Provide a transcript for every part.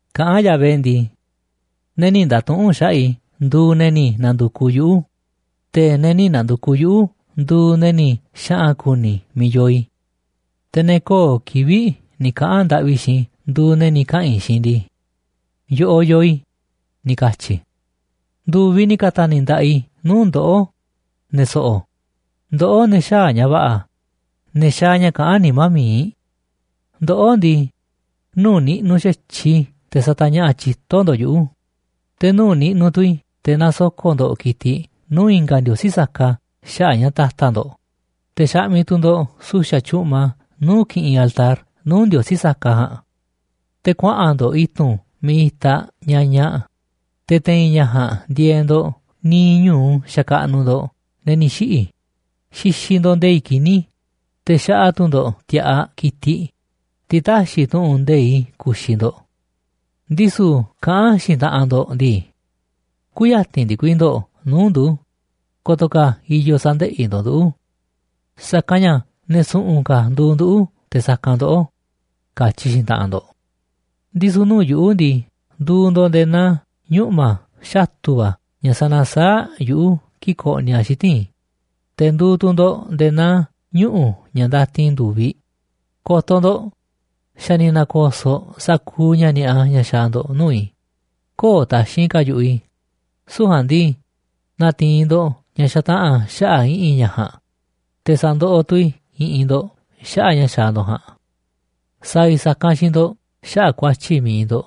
Kaꞌán Yahvé ndii: “Ne̱ nï̱ nda̱tuꞌu̱nꞌ xaꞌa̱ꞌ i̱ nduuꞌ ne̱ ni̱ na̱ndu̱kuꞌ yuꞌu̱, te̱ ne̱ nï̱ na̱ndu̱kuꞌ yuꞌu̱ nduuꞌ ne̱ ni̱ xaꞌa̱n ku̱ni̱ miiꞌ yoo i̱. Te̱ ne̱ köo̱ꞌ kivi̱ꞌ ni̱ kaꞌa̱n ndaꞌvi xiinꞌ i̱ nduuꞌ ne̱ ni̱ kaꞌa̱n i̱ xiinꞌ ndii: Yoꞌoꞌ yoo i̱, ni̱ katyi̱ i̱. Ndu̱viꞌ ni̱ ka̱ta̱ni̱ nda̱ꞌaꞌ i̱ nuu̱ꞌ ndoꞌó, ne̱ so̱ꞌo̱, ndoꞌó ne̱ xäaꞌ ña̱ va̱ꞌa̱, ne̱ xaaꞌ ña̱ kaꞌán nimá mi̱iꞌ. Ndoꞌó ndii, nuu̱ꞌ niꞌnuꞌ xa̱tyiꞌ i̱ te̱ satañaꞌa̱ꞌ tyito̱ ndo̱ꞌ yuꞌu̱, te̱ nuu̱ꞌ niꞌnuꞌ tu̱ i̱ te̱ nasoko̱ꞌ ndo̱ꞌ ki̱tiꞌ nuu̱ꞌ i̱nga̱ ndiosí saka xaꞌa̱ꞌ ña̱ ta̱ta̱ ndo̱ꞌ. Te̱ xaꞌmiꞌ tu̱ ndo̱ꞌ su̱xa̱ tyu̱ꞌma nuu̱ꞌ kiꞌinꞌ altar nuu̱ꞌ ndiosí saka ja̱a̱nꞌ. Te̱ kuaꞌa̱n ndo̱ꞌ i̱tu̱n miiꞌ itaꞌ ñañaꞌ, te̱ te̱i̱n ña̱ ja̱a̱nꞌ ndieeꞌ ndo̱ꞌ niiꞌ ñu̱u xakaꞌnuꞌ ndo̱ꞌ ne̱ ni̱ xiꞌi̱. Xixiꞌ ndo̱ꞌ nde̱i̱ꞌ kini̱, te̱ xaꞌa tu̱ ndo̱ꞌ ti̱a̱ꞌaꞌ ki̱tiꞌ, tiꞌ täxiꞌ tu̱ꞌu̱n nde̱iꞌ i̱ ku̱xi̱ ndo̱ꞌ. Ndisu̱ kaꞌán xiinꞌ taꞌanꞌ ndo̱ꞌ ndii: Kü̱ya̱ti̱n ndikui ndo̱ꞌ nuu̱ꞌ ndu̱, ko̱to̱ ka̱ i̱yo̱ sa̱ndeꞌi̱ ndo̱ꞌ nduꞌu̱. Sa̱kanꞌ ña̱ ne̱ su̱ꞌu̱n ka̱ nduuꞌ nduꞌu̱ te̱ sa̱kanꞌ ndoꞌó, katyi xiinꞌ taꞌanꞌ ndo̱ꞌ. Ndisu̱ nuu̱ꞌ yuꞌu̱ ndii, nduuꞌ ndo̱ꞌ nde̱e̱ naa ñuꞌma̱ xatu̱ va̱ ña̱ sanasaáꞌ yuꞌu̱ kii̱ꞌ koꞌniꞌ a̱ xiti̱nꞌ i̱, te̱ nduuꞌ tu̱ ndo̱ꞌ nde̱e̱ naa ñuꞌu̱ ña̱ ndatin ndu̱viꞌ. ’Ko̱to̱ ndo̱ꞌ, xa̱ ni̱ na̱ko̱so̱ꞌ sa̱kuuꞌ ña̱ ni̱a̱ꞌa ña̱ xaaꞌ ndo̱ꞌ nuu̱ꞌ i̱, köo̱ꞌ taxi̱nꞌ ka̱ yu̱ꞌuꞌ i̱. Süu̱ꞌ ja̱a̱nꞌ ndii, na̱ti̱i̱n ndo̱ꞌ ña̱ xataꞌa̱n xaꞌa̱ꞌ i̱ꞌi̱n ña̱ ja̱a̱nꞌ, te̱ sa̱ndoꞌoꞌ tu̱ i̱ i̱ꞌi̱n ndo̱ꞌ xaꞌa̱ꞌ ña̱ xaaꞌ ndo̱ꞌ ja̱a̱nꞌ. Sa̱a̱ i̱ sa̱kanꞌ xiinꞌ ndo̱ꞌ xaꞌa̱ꞌ ku̱a̱tyi̱ mi̱iꞌ ndo̱ꞌ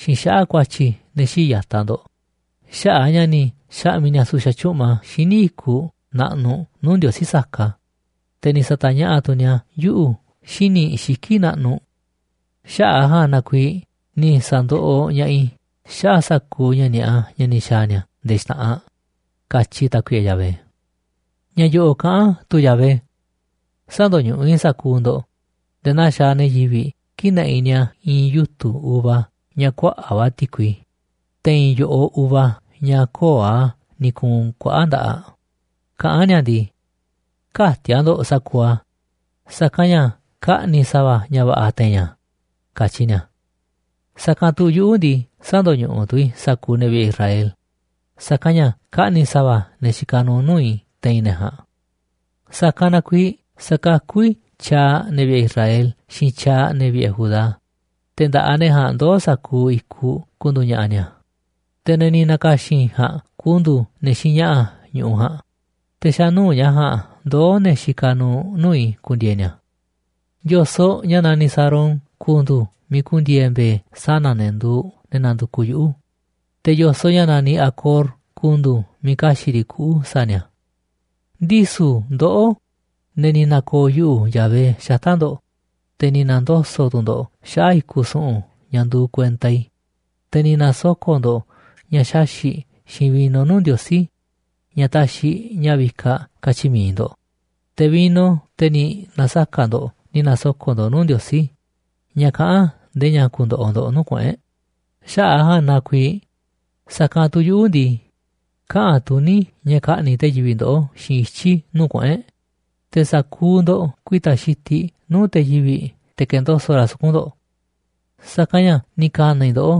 xiinꞌ xaꞌa̱ꞌ ku̱a̱tyi̱ ne̱ xii̱ꞌ ya̱taꞌ ndo̱ꞌ xaꞌa̱ꞌ a̱ ña̱ ni̱ xa̱ꞌmi̱ ni̱a̱ su̱xa̱ tyu̱ꞌma xíniꞌ i̱kuꞌ naꞌnuꞌ nuu̱ ndiosí saka, te̱ ni̱ sa̱ta̱ñaꞌa̱ꞌ tu̱ ni̱a̱ yuꞌu̱ xíniꞌ xiki̱ꞌ naꞌnuꞌ. Xaꞌa̱ꞌ a̱ ja̱a̱nꞌ na kuiiꞌ ni̱ sa̱ndoꞌoꞌ ña̱ꞌaꞌ i̱ xaꞌa̱ꞌ sa̱kuuꞌ ña̱ ni̱a̱ꞌa ña̱ ni̱ xa̱a̱ ni̱a̱ nde̱e̱ xta̱ꞌanꞌ”, katyi Tákuiꞌe Yahvé. Ña̱ yo̱ꞌo̱ꞌ kaꞌán tu Yahvé: “Sä̱ndo̱ñuꞌuꞌ i̱ sa̱kuuꞌ ndo̱ꞌ nde̱e̱ naa xaaꞌ ne̱ yivi̱ꞌ kii̱ꞌ naꞌiꞌ ni̱a̱ i̱i̱n yutu̱ uva ña̱ kuaꞌa̱ꞌ va̱ ti̱kui. Te̱i̱n yo̱ꞌoꞌ uva ña̱ köo̱ꞌ a̱ ni̱ ku̱u̱n kuaꞌa̱ꞌ nda̱ꞌaꞌ kaꞌán ni̱a̱ ndii: Kä̱ti̱a̱ ndo̱ꞌ sa̱kuuꞌ a̱, sa̱kanꞌ ña̱ kaꞌni̱ sa̱va̱ ña̱ va̱ꞌa̱ te̱i̱n a̱, katyi ni̱a̱. Sa̱kanꞌ tu̱ yuꞌu̱ ndii, sä̱ndo̱ñuꞌuꞌ tu̱ i̱ sa̱kuuꞌ ne̱ vi̱ꞌe̱ Israel, sa̱kanꞌ ña̱ kaꞌni̱ sa̱va̱ ne̱ xikaꞌ nuuꞌ nuu̱ꞌ i̱ te̱i̱n ne̱ ja̱a̱nꞌ. Sa̱kanꞌ na kuiiꞌ sa̱kakú i̱ tyaaꞌ ne̱ vi̱ꞌe̱ Israel xiinꞌ tyaaꞌ ne̱ vi̱ꞌe̱ Judá, te̱ nda̱ꞌaꞌ ne̱ ja̱a̱nꞌ ndoo̱ sa̱kuuꞌ i̱kuꞌ ku̱ndu̱u̱ ña̱ꞌa̱ ni̱a̱. Te̱ ne̱ ni̱ na̱ka̱xi̱n i̱ ja̱a̱nꞌ ku̱ndu̱u̱ ne̱ xiinꞌ ña̱ꞌa̱ ñu̱ꞌuꞌ ja̱a̱nꞌ, te̱ xa̱ nuu̱ꞌ ña̱ ja̱a̱nꞌ ndoo̱ ne̱ xikaꞌ nuuꞌ nuu̱ꞌ i̱ ku̱ndi̱e̱e̱ ni̱a̱. Yo̱soꞌ ña̱ naniꞌ Sarón ku̱ndu̱u̱ miiꞌ ku̱ndi̱e̱e̱ mbe̱e̱ sana̱ ne̱ nduuꞌ ne̱ nandukuꞌ yuꞌu̱, te̱ yo̱soꞌ ña̱ naniꞌ Acor ku̱ndu̱u̱ miiꞌ ka̱xi̱ꞌ riꞌ kuꞌu̱ sa̱a̱ ni̱a̱. ’Ndisu̱ ndoꞌó, ne̱ ni̱ na̱ko̱o̱ yuꞌu̱, Yahvé, xata̱ꞌ ndo̱ꞌ, te̱ ni̱ na̱ndoso̱ꞌ tu̱ ndo̱ꞌ xaꞌa̱ꞌ i̱kuꞌ su̱ꞌu̱n ña̱ nduuꞌ kuenta i̱, te̱ ni̱ na̱soko̱ꞌ ndo̱ꞌ ña̱ xaxi̱ꞌ xiinꞌ vino nuu̱ꞌ ndiosí ña̱ taxiꞌ ña̱ vikaꞌ, katyi mi̱iꞌ ndo̱ꞌ, te̱ vino teꞌ ni̱ na̱saka̱ ndo̱ꞌ ni̱ na̱soko̱ꞌ ndo̱ꞌ nuu̱ꞌ ndiosí ña̱ kaꞌán ndee ña̱ ku̱ndo̱ꞌo̱ ndo̱ꞌ nuu̱ꞌ kuꞌu̱n e̱ꞌ, xaꞌa̱ꞌ a̱ ja̱a̱nꞌ na kuiiꞌ sa̱kanꞌ tu̱ yuꞌu̱ ndii, kaꞌa̱n tuní ña̱ ka̱ꞌni̱ꞌ te̱ yivi̱ꞌ ndoꞌó xiinꞌ ityi̱ nuu̱ꞌ kuꞌu̱n e̱ꞌ. Te̱ sa̱kuuꞌ ndo̱ꞌ ku̱i̱ta̱ xitiꞌ nuu̱ꞌ te̱ yivi̱ꞌ te̱ ka̱ndoso̱ꞌ ra̱ suku̱nꞌ ndo̱ꞌ. Sa̱kanꞌ ña̱ ni̱ ka̱na̱ i̱ ndoꞌó,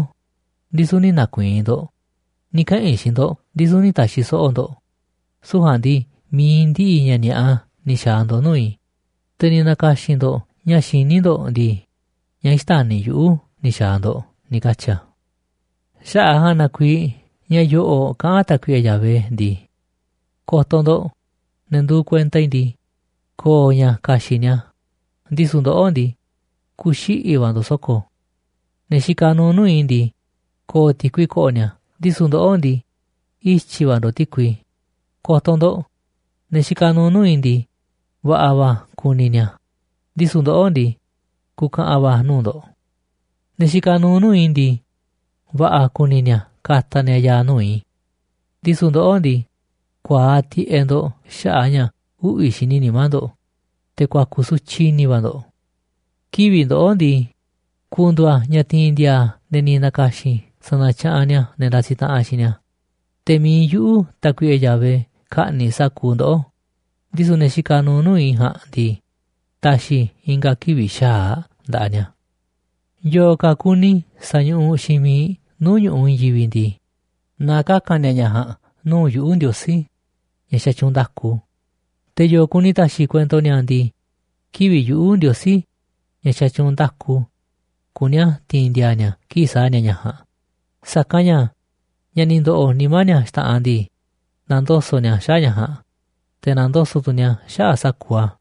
ndisu̱ nï̱ na̱ku̱i̱i̱n ndo̱ꞌ, ni̱ kaꞌa̱n i̱ xiinꞌ ndo̱ꞌ ndisu̱ nï̱ ta̱xi̱ so̱ꞌo̱ ndo̱ꞌ. Süu̱ꞌ ja̱a̱nꞌ mi̱iꞌ ndiꞌiꞌ ña̱ ni̱a̱ꞌa ni̱ xa̱a̱ ndo̱ꞌ nuu̱ꞌ i̱, te̱ ni̱ na̱ka̱xi̱n ndo̱ꞌ ña̱ xiní ndo̱ꞌ ndii, ña̱ xtäni̱ yuꞌu̱ ni̱ xa̱a̱ ndo̱ꞌ”, ni̱ katyi̱ a̱. Xaꞌa̱ꞌ a̱ ja̱a̱nꞌ na kuiiꞌ ña̱ yo̱ꞌo̱ꞌ kaꞌán Tákuiꞌe Yahvé ndii: “Ko̱to̱ ndo̱ꞌ, ne̱ nduuꞌ kuenta i̱ ndii, ko̱o̱ ña̱ ka̱xi̱ꞌ ni̱a̱, ndisu̱ ndoꞌó ndii, ku̱xiꞌi̱ va̱ ndo̱ꞌ so̱ko̱. Ne̱ xikaꞌ nuuꞌ nuu̱ꞌ i̱ ndii, ko̱o̱ ti̱kui ko̱ꞌo̱ ni̱a̱, ndisu̱ ndoꞌó ndii, ityi̱ va̱ ndo̱ꞌ ti̱kui. Ko̱to̱ ndo̱ꞌ, ne̱ xikaꞌ nuuꞌ nuu̱ꞌ i̱ ndii, va̱ꞌa̱ va̱ ku̱ni̱ ni̱a̱, ndisu̱ ndoꞌó ndii, ku̱ka̱ꞌa̱n va̱ nuu̱ꞌ ndo̱ꞌ. Ne̱ xikaꞌ nuuꞌ nuu̱ꞌ i̱ ndii, va̱ꞌa̱ kuni ni̱a̱ ka̱ta̱ ni̱a̱ ya̱a̱ nuu̱ꞌ i̱, ndisu̱ ndoꞌó ndii, ku̱a̱aꞌ tiꞌeꞌ ndo̱ꞌ xaꞌa̱ꞌ a̱ ña̱ uꞌvi̱ xini nimá ndo̱ꞌ, te̱ ku̱a̱ku̱ sutyiꞌ i̱ni̱ va̱ ndo̱ꞌ. Kivi̱ꞌ ndoꞌó ndii, ku̱ndu̱u̱ a̱ ña̱ ti̱i̱n ndi̱a̱a̱ ne̱ ni̱ na̱ka̱xi̱n i̱ sa̱na̱tyaꞌanꞌ ni̱a̱ ne̱ ndasiꞌ taꞌanꞌ xiinꞌ ni̱a̱. Te̱ mi̱iꞌ yuꞌu̱, Tákuiꞌe Yahvé, ka̱ꞌni̱ꞌ sa̱kuuꞌ ndoꞌó, ndisu̱ ne̱ xikaꞌ nuuꞌ nuu̱ꞌ i̱ ja̱a̱nꞌ ndii, ta̱xi̱ i̱ i̱nga̱ kivi̱ꞌ xa̱aꞌ nda̱ꞌaꞌ ni̱a̱. Yo̱o̱ ka̱ kuni sa̱ñuꞌuꞌ xiinꞌ miiꞌ nuu̱ꞌ ñu̱ꞌuꞌ i̱i̱n yivi̱ꞌ ndii, na kaka̱n ni̱a̱ ña̱ ja̱a̱nꞌ nuu̱ꞌ yuꞌu̱ Ndiosí, ña̱ xatyuunꞌ nda̱ku. Te̱ yo̱o̱ kuni ta̱xi̱ kuento ni̱a̱ ndii, kivi̱ꞌ yuꞌu̱, Ndiosí, ña̱ xatyuunꞌ nda̱ku, kuní a̱ ti̱i̱n ndi̱a̱a̱ ni̱a̱ kii̱ꞌ sa̱a̱ ni̱a̱ ña̱ ja̱a̱nꞌ. Sa̱kanꞌ ña̱ ña̱ ni̱ ndo̱ꞌo̱ nimá ni̱a̱ xta̱ꞌanꞌ ndii, na̱ndoso̱ꞌ ni̱a̱ xaꞌa̱ꞌ ña̱ ja̱a̱nꞌ, te̱ na̱ndoso̱ꞌ tu̱ ni̱a̱ xaꞌa̱ꞌ sa̱kuuꞌ a̱.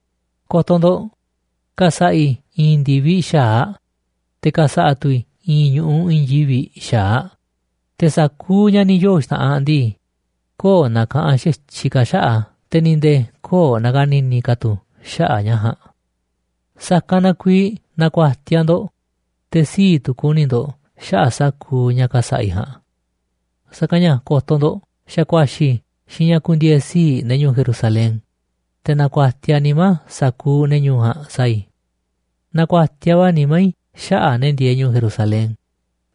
’Ko̱to̱ ndo̱ꞌ, ka̱sa̱ꞌa̱ i̱ i̱i̱n ndi̱viꞌ xa̱aꞌ, te̱ ka̱sa̱ꞌa̱ tu̱ i̱ i̱i̱n ñu̱ꞌuꞌ i̱i̱n yivi̱ꞌ xa̱aꞌ. Te̱ sa̱kuuꞌ ña̱ ni̱ yoo̱ xta̱ꞌanꞌ ndii, köo̱ꞌ na̱ka̱ꞌanꞌ xa̱tyiꞌ ka̱ xaꞌa̱ꞌ a̱, te̱ ni̱ nde̱e̱ köo̱ꞌ na̱ka̱ni̱ni̱ ka̱ tu̱ xaꞌa̱ꞌ ña̱ ja̱a̱nꞌ. Sa̱kanꞌ na kuiiꞌ na̱ku̱a̱tiaꞌ ndo̱ꞌ, te̱ sii̱ꞌ tu̱ ku̱ni̱ ndo̱ꞌ xaꞌa̱ꞌ sa̱kuuꞌ ña̱ ka̱sa̱ꞌa̱ i̱ ja̱a̱nꞌ. Sa̱kanꞌ ña̱ ko̱to̱ ndo̱ꞌ, xa̱ ku̱a̱xi̱ i̱ xiinꞌ ña̱ ku̱ndi̱e̱e̱ sii̱ꞌ ne̱ ñu̱u̱ Jerusalén, te̱ na̱ku̱a̱tiaꞌ nimá sa̱kuuꞌ ne̱ ñu̱u̱ ja̱a̱nꞌ sa̱a̱ i̱. Na̱ku̱a̱tiaꞌ va̱ nimá i̱ xaꞌa̱ꞌ ne̱ ndieeꞌ ñu̱u̱ Jerusalén,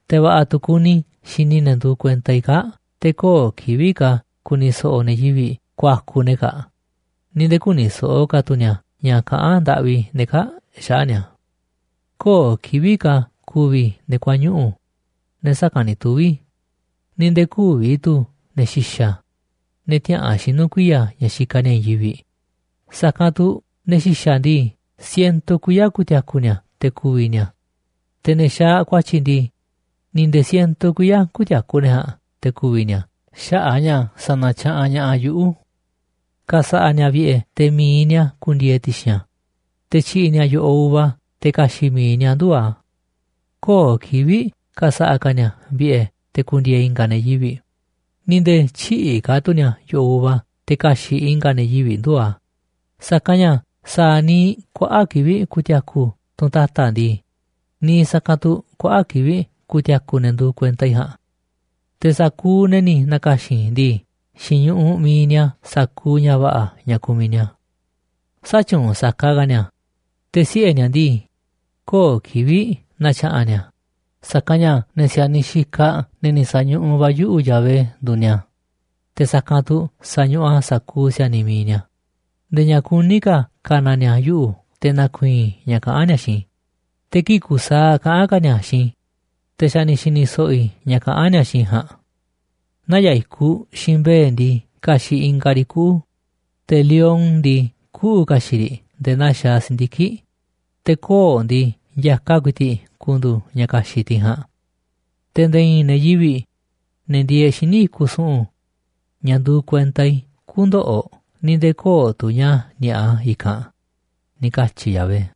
te̱ va̱ꞌa̱ tu̱ kuni i̱ xini i̱ ne̱ nduuꞌ kuenta i̱ kaa̱ꞌ. Te̱ köo̱ꞌ kivi̱ꞌ ka̱ ku̱ni̱ so̱ꞌo̱ ne̱ yivi̱ꞌ ku̱a̱ku̱ ne̱ kaa̱ꞌ ni̱ nde̱e̱ kü̱ni̱ so̱ꞌo̱ ka̱ tu̱ ni̱a̱ ña̱ kaꞌán ndaꞌvi ne̱ kaa̱ꞌ xaꞌa̱ꞌ ni̱a̱. ’Köo̱ꞌ kivi̱ꞌ ka̱ ku̱vi̱ ne̱ kuañuꞌu̱, ne̱ saka̱nꞌ ni̱ tuvi̱. Ni̱ nde̱e̱ kü̱vi̱ tu̱ ne̱ xi̱xa̱, ne̱ tiäꞌa̱an xinuꞌ kuiya̱ ña̱ xikaꞌ ni̱a̱ i̱i̱n yivi̱ꞌ. Sa̱kanꞌ tu̱ ne̱ xi̱xa̱ ndii, siento kuiya̱ ku̱ti̱a̱ku̱ ni̱a̱ te̱ ku̱vi̱ ni̱a̱. Te̱ ne̱ xaaꞌ ku̱a̱tyi̱ ndii, ni̱ nde̱e̱ siento kuiya̱ kü̱ti̱a̱ku̱ ne̱ ja̱a̱nꞌ te̱ ku̱vi̱ ni̱a̱ xaꞌa̱ꞌ a̱ ña̱ sa̱na̱tyaꞌanꞌ ña̱ꞌaꞌ yuꞌu̱. Ka̱sa̱ꞌa̱ ni̱a̱ vi̱ꞌe̱ te̱ mi̱iꞌ ni̱a̱ ku̱ndi̱e̱e̱ ti̱xi̱n a̱, te̱ tyi̱ꞌi̱ ni̱a̱ yo̱ꞌoꞌ uva̱ te̱ ka̱xi̱ꞌ mi̱iꞌ ni̱a̱ nduu̱ꞌ a̱. Köo̱ꞌ kivi̱ꞌ ka̱sa̱ꞌa̱ ka̱ ni̱a̱ vi̱ꞌe̱ te̱ ku̱ndi̱e̱e̱ i̱nga̱ ne̱ yivi̱ꞌ, ni̱ nde̱e̱ tyï̱ꞌi̱ ka̱ tu̱ ni̱a̱ yo̱ꞌoꞌ uva te̱ ka̱xi̱ꞌ i̱nga̱ ne̱ yivi̱ꞌ nduu̱ꞌ a̱. Sa̱kanꞌ ña̱ sa̱a̱ niiꞌ kuaꞌa̱ꞌ kivi̱ꞌ tiaku tunꞌ ta̱ta̱ ndii, niiꞌ sa̱kanꞌ tu̱ kuaꞌa̱ꞌ kivi̱ꞌ ku̱ti̱a̱ku̱ ne̱ nduuꞌ kuenta i̱ ja̱a̱nꞌ. Te̱ sa̱kuuꞌ ne̱ ni̱ na̱ka̱xi̱n i̱ ndii, xi̱ñuꞌuꞌ mi̱iꞌ ni̱a̱ sa̱kuuꞌ ña̱ va̱ꞌa̱ ña̱ kumiꞌ ni̱a̱. Sätyuunꞌ saka ka̱ ni̱a̱, te̱ siꞌe̱ ni̱a̱ ndii, köo̱ꞌ kivi̱ꞌ na̱tya̱ꞌa̱n ni̱a̱. Sa̱kanꞌ ña̱ ne̱ si̱a̱niꞌ xikaꞌ ne̱ ni̱ sa̱ñuꞌuꞌ va̱ yuꞌu̱, Yahvé, nduuꞌ ni̱a̱, te̱ sa̱kanꞌ tu̱ sa̱ñuꞌuꞌ a̱ sa̱kuuꞌ si̱a̱niꞌ mi̱iꞌ ni̱a̱. Nde̱e̱ ña̱ kuní ka̱ ka̱na̱ ni̱a̱ yuꞌu̱, te̱ na̱ku̱i̱i̱n i̱ ña̱ kaꞌán ni̱a̱ xiinꞌ i̱. Te̱ kii̱ꞌ kusaaꞌ kaꞌán ka̱ ni̱a̱ xiinꞌ i̱, te̱ xa̱ ni̱ xi̱ni̱ so̱ꞌo̱ i̱ ña̱ kaꞌán ni̱a̱ xiinꞌ i̱ ja̱a̱nꞌ. Naya̱ꞌ i̱kuꞌ xiinꞌ mbe̱e̱ ndii, ka̱xi̱ꞌ ingaꞌ riꞌ kuꞌu̱. Te̱ lion ndii, kuꞌu̱ ka̱xi̱ꞌ riꞌ nde̱e̱ naa xaaꞌ si̱ndiki̱ꞌ. Te̱ koo̱ꞌ ndii, ya̱kaꞌ ku̱i̱ti̱ꞌ ku̱ndu̱u̱ ña̱ ka̱xi̱ꞌ tiꞌ ja̱a̱nꞌ. Te̱ nde̱e̱ i̱i̱n ne̱ yivi̱ꞌ, ne̱ ndieeꞌ xíniꞌ i̱kuꞌ su̱ꞌu̱n, ña̱ nduuꞌ kuenta i̱, kü̱ndo̱ꞌo̱, ni̱ nde̱e̱ köo̱ꞌ tu̱ ña̱ ni̱a̱ꞌa i̱kanꞌ”, ni̱ katyi̱ Yahvé.